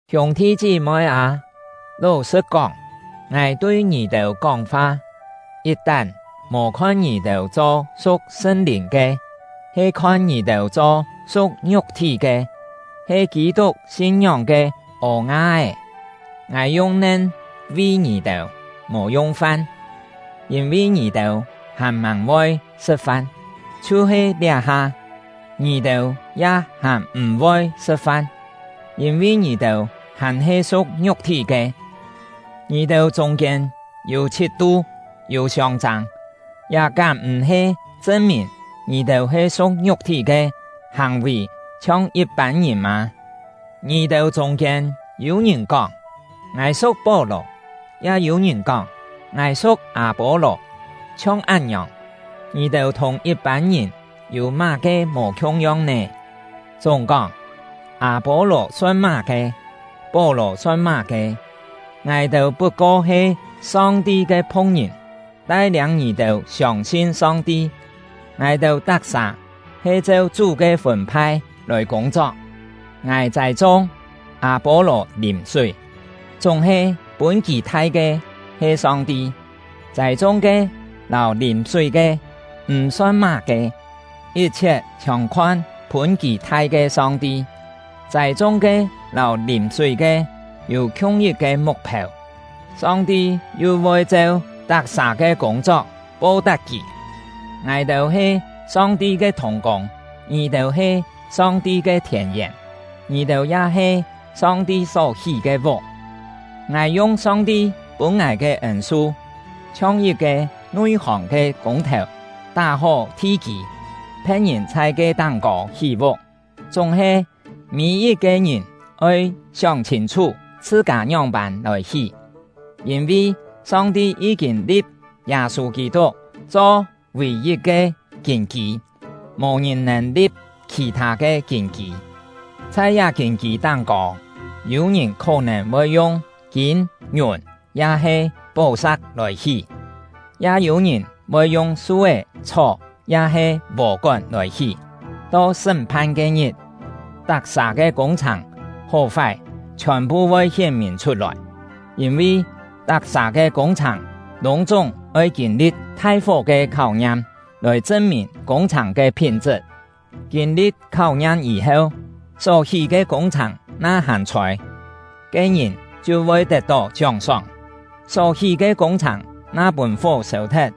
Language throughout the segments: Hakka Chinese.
Hiûng-thi chí-moi â, ló-sṳ̍t kóng, ngài tui ngì-têu kóng-fa, yit-tán mò khon ngì-têu cho su̍k Sṳn-Lìn ke, he khon ngì-têu cho su̍k ngiuk-thí ke, he Kî-tuk sin-ngióng ke ô-nga-é. Ngài yung nen vi ngì-têu, mò yung fan, yîn-vi ngì-têu hàn-màng voi sṳ̍t-fan. Chhiu-he liá-ha, ngì-têu ya hàn m̀-voi sṳ̍t-fan, yîn-vi ngì-têu hàn-he su̍k ngiuk-thí ke. Ngì-têu chûng-kiên yû chhit-tu, yû siông-châng; liá kám m̀-he chṳn-mìn ngì-têu he su̍k ngiuk-thí ke, hàng-vì chhiong yit-pân ngìn mâ? Ngì-têu chûng-kiên yû-ngìn kóng: “Ngài su̍k Pó-lò”; ya yû-ngìn kóng: “Ngài su̍k Â-pô-lò”. Chhiong án-ngiòng, ngì-têu thùng yit-pân ngìn yû má-ke mò khiung-yong nè? Chúng-kóng, Â-pô-lò son má-ke? Pó-lò son má-ke? Ngài-têu put-ko he Song-ti ke phu̍k-ngìn, tai-liâng ngì-têu siông-sin Song-ti. Ngài-têu tak-sà he cheu Chú ke fûn-phai lòi kûng-chok: Ngài châi-chung, Â-pô-lò lìm-súi, chúng-he pûn kì thai ke he Song-ti. Châi-chung-ke lâu lìm-súi-ke m̀-son má-ke; yit-chhiet chhiòn khon pûn kì thai ke Song-ti. Châi-chung-ke lâu lìm-súi-ke yû khiung yit-ke muk-phêu; Song-ti yu voi cheu tak-sà ke kûng-chok po-tap kì. Ngài-têu he Song-ti ke thùng-kûng; ngì-têu he Song-ti ke thièn-yèn. Ngì-têu ya he Song-ti só hí ke vuk. Ngài yung Song-ti pûn ngài ke ên-su, chhiong yit-ke nui-hòng ke kûng-thèu tá-hó thi-kî, phe̍t-ngìn chhai ke táng-kô hí-vuk. Chúng-he, mî-yit-ke ngìn oi sióng chhîn-chhú chhṳ-kâ ngióng-pân lòi hí. Yîn-vi Song-ti yí-kîn li̍p Yâ-sû Kî-tuk cho vì-yit ke kîn-kî, mò-ngìn nèn li̍p khì-thâ ke kîn-kî. Chhai liá kîn-kî táng-kô, yû-ngìn khó-nèn voi yung kîm, ngiùn, ya-he pó-sa̍k lòi hí; ya yû-ngìn voi yung su-é, chhó, ya-he vò-kón lòi hí. To sṳ́m-phan ke-ngit, tak-sà ke kûng-chhàng hó-fái chhiòn-phu voi hién-mìn chhut-lòi; yîn-vi tak-sà ke kûng-chhàng lûng-chúng oi kîn-li̍t thai-fó ke kháu-ngiam, lòi chṳn-mìn kûng-chhàng ke phín-chṳt. Kîn-li̍t kháu-ngiam yî-heu, só hí ke kûng-chhàng na hàn chhôi, ke-ngìn chhiu voi tet-tó chióng-sóng. Só hí ke kûng-chhàng na pûn fó sêu-thet,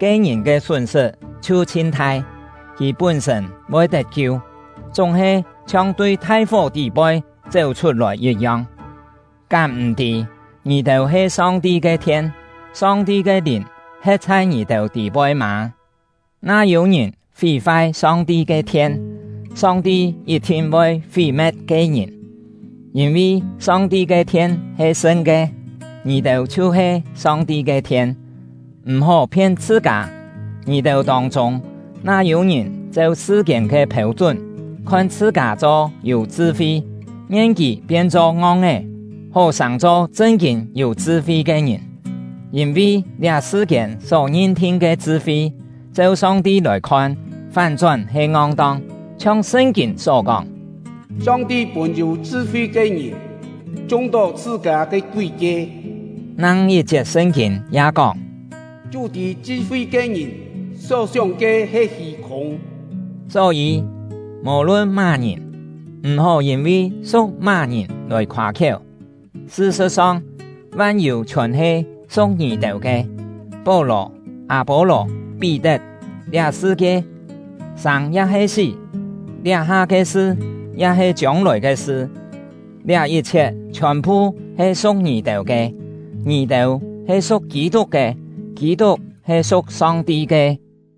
ke-ngìn ke sún-sṳt chhiu chhin thai; kì pún-sṳ̂n voi tet-kiu, chúng-he chhiong tui thai-fó tî-poi chéu-chhut-lòi yit-yong. Kám m̀-tî ngì-têu he Song-ti ke thien, Song-ti ke Lìn he̍t chhai ngì-têu tî-poi mâ? Na yû-ngìn fí-fai Song-ti ke thien, Song-ti yit-thin voi fí-me̍t ke-ngìn; yîn-vi Song-ti ke thien he sṳn ke. Ngì-têu chhiu-he Song-ti ke thien. M̀-hó phien chhṳ-kâ. Ngì-têu tông-chûng na yû-ngìn cheu sṳ-kiên ke phêu-chún khon chhṳ-kâ cho yû chṳ-fi, ngien kì pien-cho ngong-é, hó sàng-cho chṳn-kîn yû chṳ-fi ke ngìn. Yîn-vi liá sṳ-kiên só ngin-thin ke chṳ-fi, cheu Song-ti lòi-khon fán-chón he ngong-tong. Chhiong Sṳn-kîn só kóng: “Song-ti pûn yû chṳ-fi ke ngìn chung-tó chhṳ-kâ ke kúi-kie.” Nang yit-chiet Sṳn-kîn ya kóng: “Chú tî chṳ-fi ke ngìn só-sióng ke he hî-khûng.” Só-yî, mò-lun má-ngìn, m̀-hó yîn-vi su̍k má-ngìn lòi khoâ-khiéu. Sṳ-sṳ̍t-song, van-yû chhiòn he su̍k ngì-têu ke: Pó-lò, Â-pô-lò, Pí-tet, liá sṳ-kie, sâng ya-he sí, liá-ha ke sṳ ya-he chiông-lòi ke sṳ, liá yit-chhiet chhiòn-phu he su̍k ngì-têu ke; ngì-têu he su̍k Kî-tuk ke, Kî-tuk he su̍k Song-ti ke.